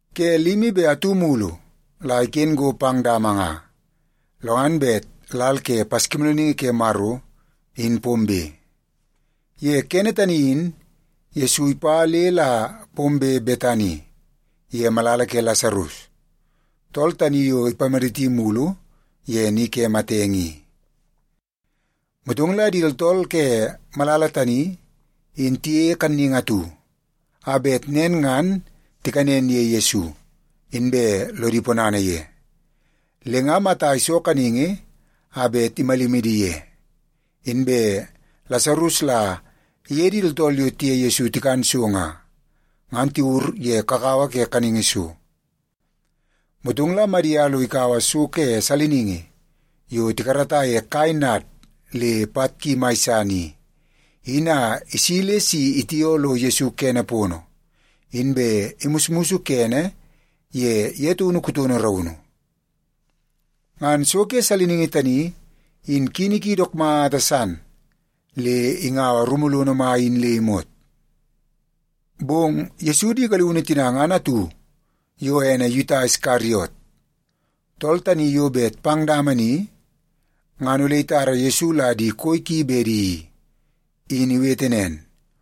Ke limi be atu mulu la iken go pang dama nga, lo ngan bet lal ke Paskimoolooningi Ke Maro, in pombe. Ye kene tani in Yesu ipa le la pombe Betani, ye malala ke Lasarus, tool tani yo ipamaditi mulu ye ni ke matenge i. Motong la di tooltool ke malala tani in tiyeie kanningi atu a bet nen ngan tikanen ye Yesu, inbe lodi ponana ye. Le nga Mata iso kaningi a bet imalimi di ye, inbe Lasarus la iye di tooltool yo tiye Yesu tikan so nga, ngan tiwur ye kakawa ke kaningi so. Motong la Madia lo ikaua so ke saliningi yo tikarata ye kai nad le pat ki mai san i, in a isi le si itioo lo Yesu kene pono, inbe imusmus kene ye ye taunu kutono raunu. Ngan so ke saliningi tani in kini ki dook mata san le ingaua rumu lono mai in le imot. Bong Yesu di galiunu tina ngan atu, yo ene Yuta Iskariot, tool tani yo bet pang dama ni ngan ole itara Yesu la di koi ki bedi i, in iwete nen,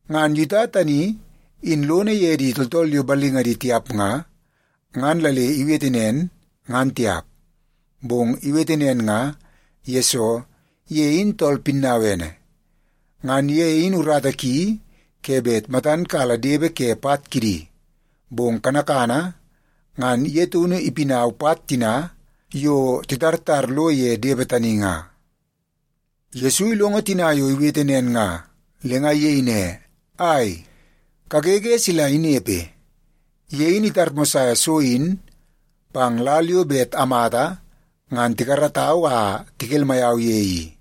Ngan Yuta tani in lono ye di tooltool yo ballingadi tiap nga, ngan la le iwete nen, ngan tiap. Bong iwete nen nga, yesoo ye in tool pinnauene. Ngan ye in urata ki ke bet matan kala depe ke pat kidi, bong kanakana ngan ye taunu ipinau pat tina yo titartar lo ye depe tani nga. Yesu ilongo tina yo iwete nen nga, le nga iyei ne, “Ai, kagege sila inepe! Ye in itarmosaia so in pang lal yo bet amata ngan tikaratau a tikelmai au ye i.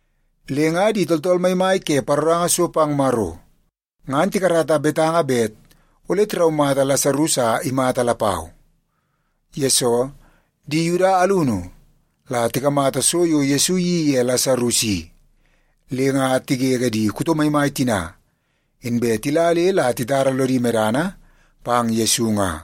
Le nga di tooltool maimai ke paroranga so pang Maro ngan tikarata betanga bet ole tiraumata Lasarus a imata lapau. Yesoo, di Yuda alunu la tikamata so yo Yesu iyeii ye Lasarus i, le nga tigege di kuto maimai tina, inbe tila le la titara lodi medana pang Yesu nga.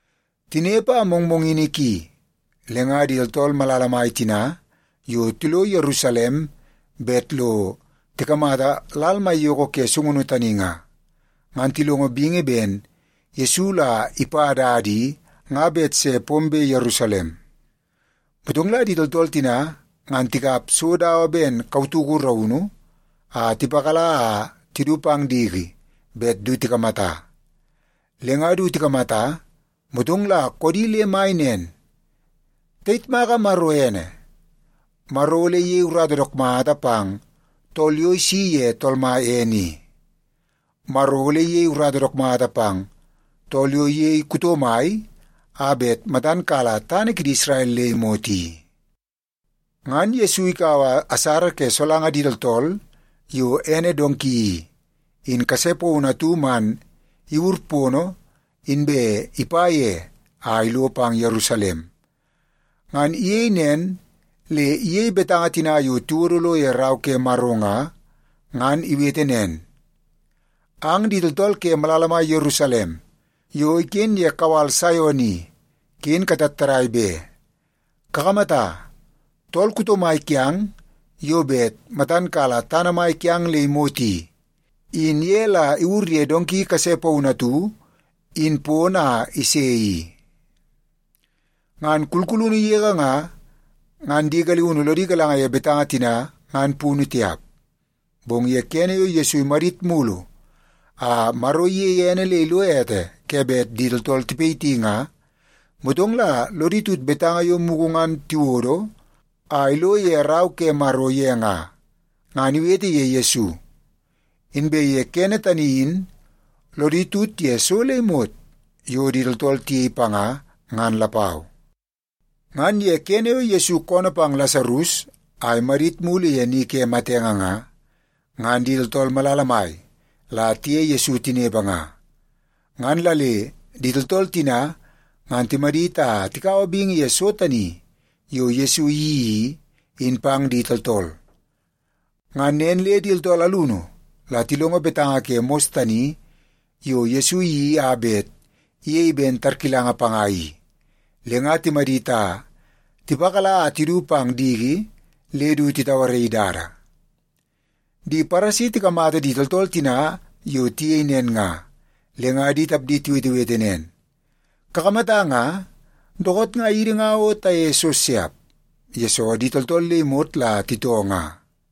Tinepe a mongmongini ki, le nga di tooltool malala mai tina yo tilo Yerusalem bet lo tikamata lal maiyoko ke sungunu tani nga, ngan tilongo bingi ben Yesu la ipa dada i nga bet se pombe Yerusalem. Motong la di tooltool tina ngan tikap so dawa ben kautuku raunu a tipakala a tidu pang diki bet du tikamata. Le nga du tikamata, motong la koodi le mai nen. “Tayitmaka Maro ene! Maro ole iyei urata dook mata pang tool yo isi ye Tool Mai ene i. Maro ole iyei urata dook mata pang tool yo iyei kuto mai a bet matan kala tana kidi Isrel le imot i.” Ngan Yesu ikaua asara ke solanga di tooltool yo ene donki i, in kase paunu atu man iwur pono, inbe ipa ye a ilo pang Yerusalem. Ngan iyei nen le iyei betanga tina yo tiwodo lo ye Rau ke Maro nga, ngan iwete nen, “Ang di tooltool ke malala mai Yerusalem yo iken ye kawal Saion i, ken katattadai be! Kakamata, tool kuto mai kiang yo bet matan kala tana mai kiang le imot i, in ye la iwur ye donki kase paunu atu in pono, a ise i.” Ngan kulkulunu yege nga, ngan di galiunu lodi galanga ye betanga tina ngan punu tiap. Bong ye kene yo Yesu imadit mulu a Maro iyeie ene le ilo ete ke bet di tooltool tipayiti nga, motong la lodi tut betanga yo mugu ngan tiwodo a ilo ye Rau ke Maro ye nga, ngan iwete ye Yesu. Inbe ye kene tani in lodi tut ye so le imot yo di tooltool tiyei panga ngan lapau. Ngan ye kene yo Yesu koonoo pang Lasarus a imadit mulu ye ni ke matenge nga, ngan di tooltool malala mai la tiye Yesu tinepe nga. Ngan la le di tooltool tina ngan timadit a tikaua bingi ye so tani yo Yesu iyeii i, in pang di tooltool. Ngan nen le di tooltool alunu la tilongo betanga ke mos tani yo Yesu iyeii a bet iyei ben tarkilanga panga i, le nga timadit a tipakala a tidu pang diki le du titauaraii dada. Di Paresi tikamata di tooltool tina yo tiyei nen nga, le nga di tapdi tiwetewete nen, “Kakamata nga, dookoot nga idi nga o tayeie so siap, yesoo di tooltool le imot la titoo nga.”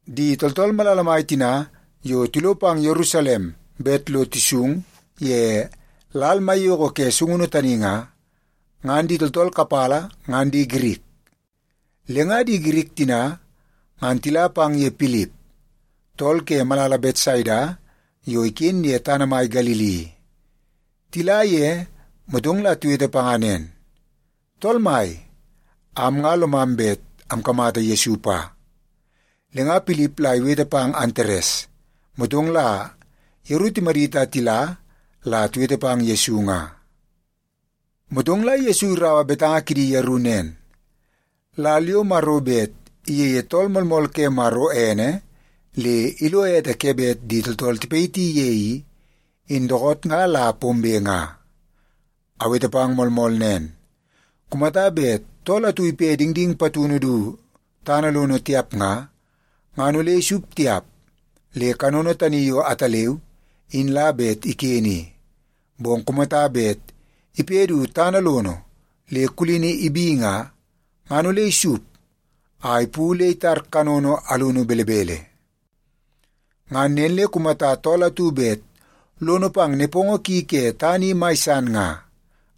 Di tooltool malala mai tina yo tilo pang Yerusalem bet lo tisung ye lal maiyoko ke sungunu tani nga, ngan di tooltool kapala ngan di Girik. Le nga di Girik tina ngan tila pang ye Pilip, tool ke malala Betsaida yo iken ye tana mai Galili i. Tila ye, motong la tiwete panga nen, “Tool mai, am nga lomam bet amkamata Yesu pa.” Le nga Pilip la iwete pang Antares, motong la yeru timadit a tila la tiwete pang Yesu nga. Motong la Yesu iraua betanga kidi yeru nen, “Lal yo Maro bet iyeie Tool Moolmool ke Maro ene le ilo ete ke bet di tooltool tipayiti ye i, in dookoot nga la pombe nga. Awete pang moolmool nen, kumata bet tool atu ipe dingding patunu du tana lono tiap nga, ngan ole isup tiap le kanono tani yo ataleu in la bet iken i. Bong kumata bet ipe du tana lono le kulini ibi nga, ngan ole isup a ipu le itar kanono alunu belebele. Ngan nen le kumata tool atu bet lono pang nepongo ki ke tana i mai san nga,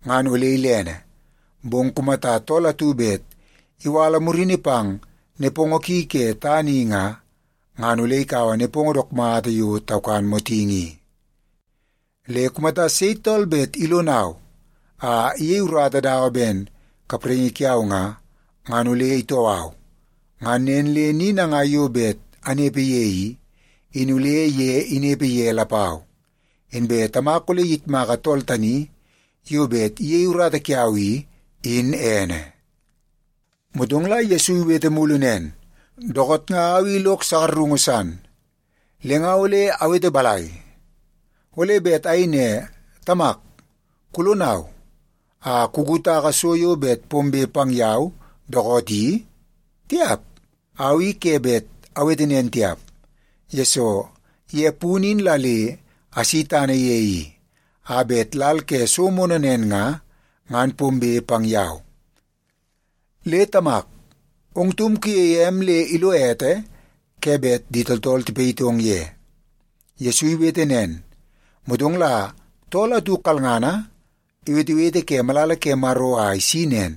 ngan ole ilene. Bong kumata tool atu bet iwala murini pang nepongo ki ke tana i nga, ngan ole ikaua nepongo dook mata yo taukan motingi i. Le kumata sei tool bet ilonau a iyei urata dawa ben kapraingi kiau nga, ngan ole itoo au. Ngan nen le ni nangai yo bet anepe ye i, in ole ye inepe ye lapau. Inbe Tamak ole iyitmaka tool tani yo bet iyei urata kiau i, in ene.” Motong la Yesu iwete mulu nen, “Dookoot nga au i lok sakarungu san, le nga ole awete balai? Ole bet ayei ne, ‘Tamak, kulonau a kukutaka so yo bet pombe pang yau dookoot i’? Tiap! Au i ke bet awete nen tiap, yesoo ye punu in la le asi tana ye i, a bet lal ke so moonoo nen nga, ngan pombe pang yau. Le Tamak, ong taum kuyeie em le ilo ete ke bet di tooltool tipayitong ye!” Yesu iwete nen, motong la tool atu kalngana iwetewete ke malala ke Maro a isi nen,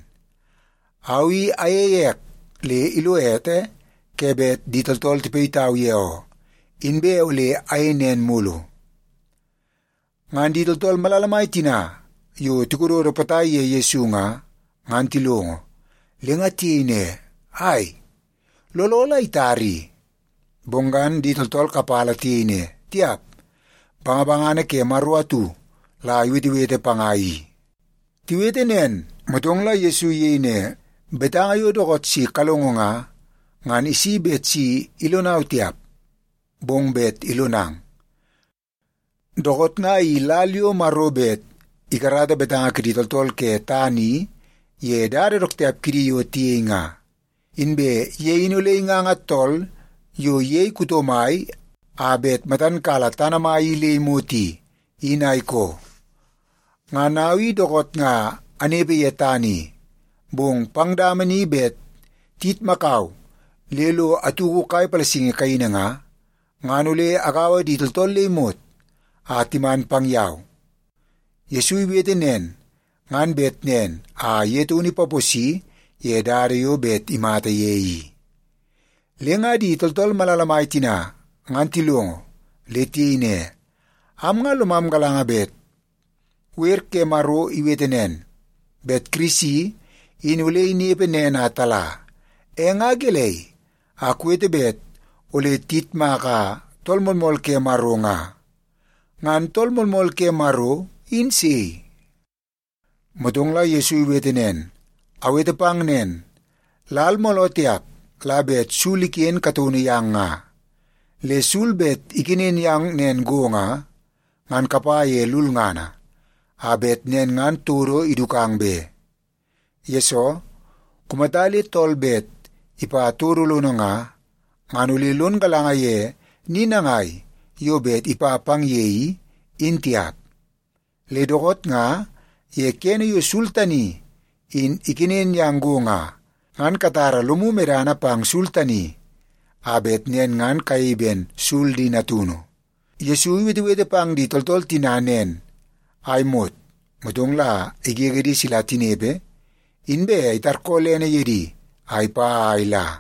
“Au i ayeie ek le ilo ete ke bet di tooltool tipayitau ye oo, inbe ole ayei nen mulu.” Ngan di tooltool malala mai tina yo tikododo potai ye Yesu nga, ngan tilongo, le nga tiyei ne, “Ai, looloo la itara i.” Bong ngan di tooltool kapala tiyei ne, “Tiap! Bangabangana ke Maro atu la iwetewete panga i.” Tiwete nen, motong la Yesu iyei ne, “Betanga yo dookoot si kalongo nga, ngan isi bet si ilonau tiap, bong bet ilonang. Dookoot nga i lal yo Maro bet ikarata betanga kidi tooltool ke tana i ye dada dook tiap kidi yo tiyei nga. Inbe ye in ole inganga tool yo iyei kuto mai a bet matan kala tana mai i le imot i, in a ikoo. Ngan au i dookoot nga anepe ye tana i, bong pang dama ni bet tiyitmakau le lo atuku kai palasingi kaini nga, ngan ole agaua di tooltool le imot a timan pang yau.” Yesu iwete nen ngan bet nen a ye taunu ipaposi ye dada yo bet imata ye i. Le nga di tooltool malala mai tina ngan tilongo, le tiyei ne, “Am nga lomam galanga bet wer ke Maro iwete nen, bet Kirisi in ole inepe nen a tala. E nga gelei a kuwete bet ole tiyitmaka Tool Moolmool ke Maro nga? Ngan Tool Moolmool ke Maro in sei?” Motong la Yesu iwete nen, “Awete pang nen, lal mooloo tiap la bet sul iken kataunu yang nga. Le sul bet ikenen yang nen go nga, ngan kapa ye lulngana, a bet nen ngan todo idukang be. Yesoo, kumata le tool bet ipa todo lono nga, ngan ole lon galanga ye ni nangai yo bet ipa pang ye i, in tiap. Le dookoot nga ye kene yo sul tani in ikenen yang go nga, ngan katara lomu medana pang sul tani a bet nen ngan kayei ben sul di natunu.” Yesu iwetewete pang di tooltool tina nen a imot, motong la igege di sila tinepe, inbe itarkoolene ye di a ipa a ila.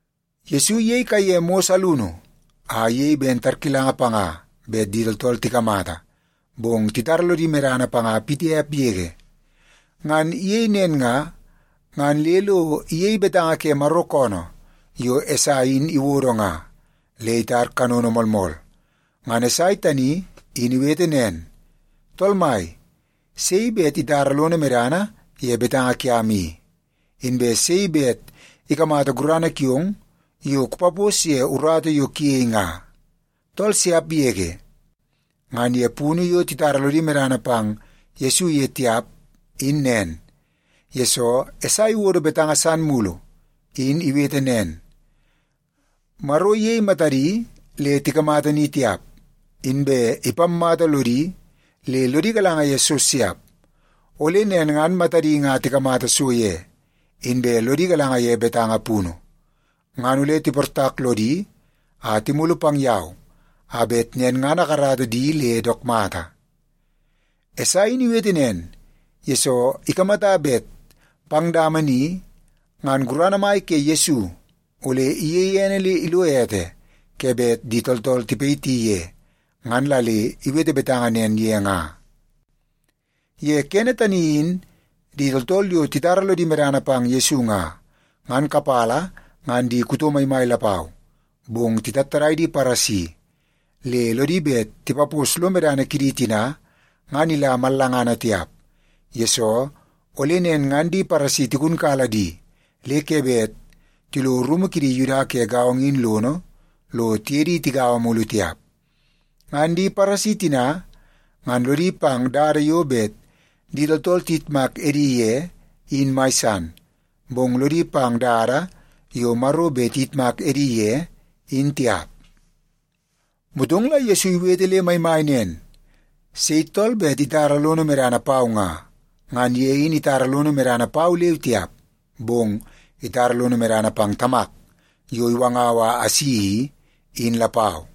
Yesu iyei kaiye mos alunu a iyei ben tarkilanga panga bet di tooltool tikamata, bong titara lodi medana panga pitiap yege. Ngan iyei nen nga, ngan le lo iyei betanga ke Maro koonoo yo Esai in iwodo nga, le itar kanono moolmool. Ngan Esai tani in iwete nen, “Tool Mai, sei bet itara lono medana ye betanga kiam i, inbe sei bet ikamata gurana kiong yo kupapos ye urata yo kuyei nga? Tool siap yege.” Ngan ye punu yo titara lodi medana pang Yesu ye tiap in nen, yesoo Esai iwodo betanga san mulu in iwete nen, “Maro iyei matadi le tikamata ni tiap, inbe ipammata lodi le lodi galanga ye so siap. Ole nen ngan matadi nga tikamata so ye, inbe lodi galanga ye betanga punu, ngan ole tiportak lodi a timulu pang yau a bet nen ngan akarata di le dook mata.” Esai in iwete nen, yesoo ikamata bet pang dama ni ngan gurana mai ke Yesu ole iyeie ene le ilo ete ke bet di tooltool tipayiti ye, ngan la le iwete betanga nen ye nga. Ye kene tani in di tooltool yo titara lodi medana pang Yesu nga, ngan kapala ngan di kuto maimai lapau. Bong titattadai di Paresi, le lodi bet tipapos lo medana kidi tina ngan ila mallangana tiap, yesoo ole nen ngan di Paresi tigunkala di le ke bet tilo rumu kidi Yuda ke gaongo in lono lo tiye di tigaua mulu tiap. Ngan di Paresi tina ngan lodi pang dada yo bet di tooltool tiyitmak edi ye, in mai san, bong lodi pang dada yo Maro bet iyitmak edi ye, in tiap. Motong la Yesu iwete le maimai nen, “Sei tool bet itara lono medana pau nga, ngan ye in itara lono medana pau leu tiap, bong itara lono medana pang Tamak yo iwangau a asi i, in lapau.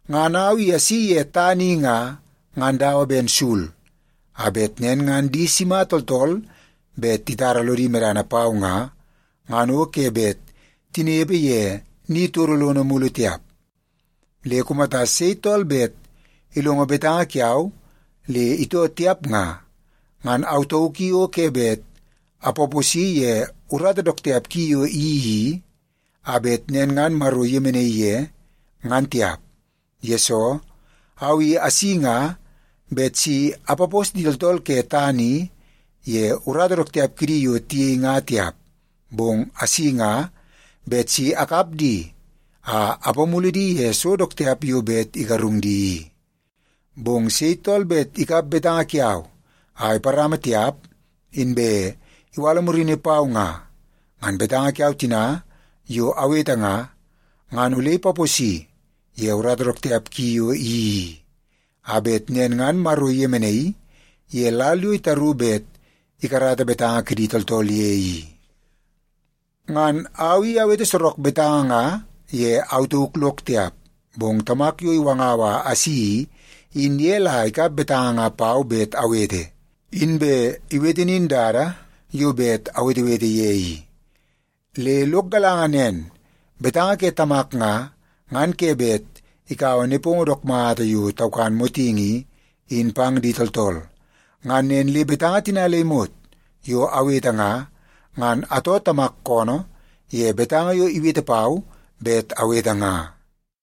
Ngan au i asi ye tana i nga, ngan dawa ben sul, a bet nen ngan di sima tooltool bet titara lodi medana pau nga, ngan o ke bet tinepe ye ni todo lono mulu tiap. Le kumata sei bet ilongo betanga kiau le itoo tiap nga, ngan au tauk i o ke bet apaposi ye urata dook tiap ki yo iyeii i, a bet nen ngan Maro iyemenaii ye, ngan tiap. Yesoo, au i asi nga bet si apapos di tooltool ke tana i ye urata dook tiap kidi yo tiyei nga tiap, bong asi nga bet si akap di a apamulu di ye so dook tiap yo bet igarung di i. Bong sei tool bet ikap betanga kiau a iparama tiap, inbe iwala murini pau nga, ngan betanga kiau tina yo awete nga, ngan ole ipaposi ye urata dook tiap ki yo iyeii i, a bet nen ngan Maro iyemenai ye lal yo itaru bet ikarata betanga kidi tooltool ye i. Ngan au i awete sorok betanga nga ye au tauk lok tiap, bong Tamak yo iwangau a asi i, in ye la ikap betanga nga pau bet awete, inbe iwete nin dada yo bet awetewete ye i. Le lok galanga nen, betanga ke Tamak nga, ngan ke bet ikaua nepongo dook mata yo taukan motingi i, in pang di tooltool. Ngan nen le betanga tina le imot yo awete nga, ngan atoo Tamak koonoo ye betanga yo iwete pau bet awete nga.”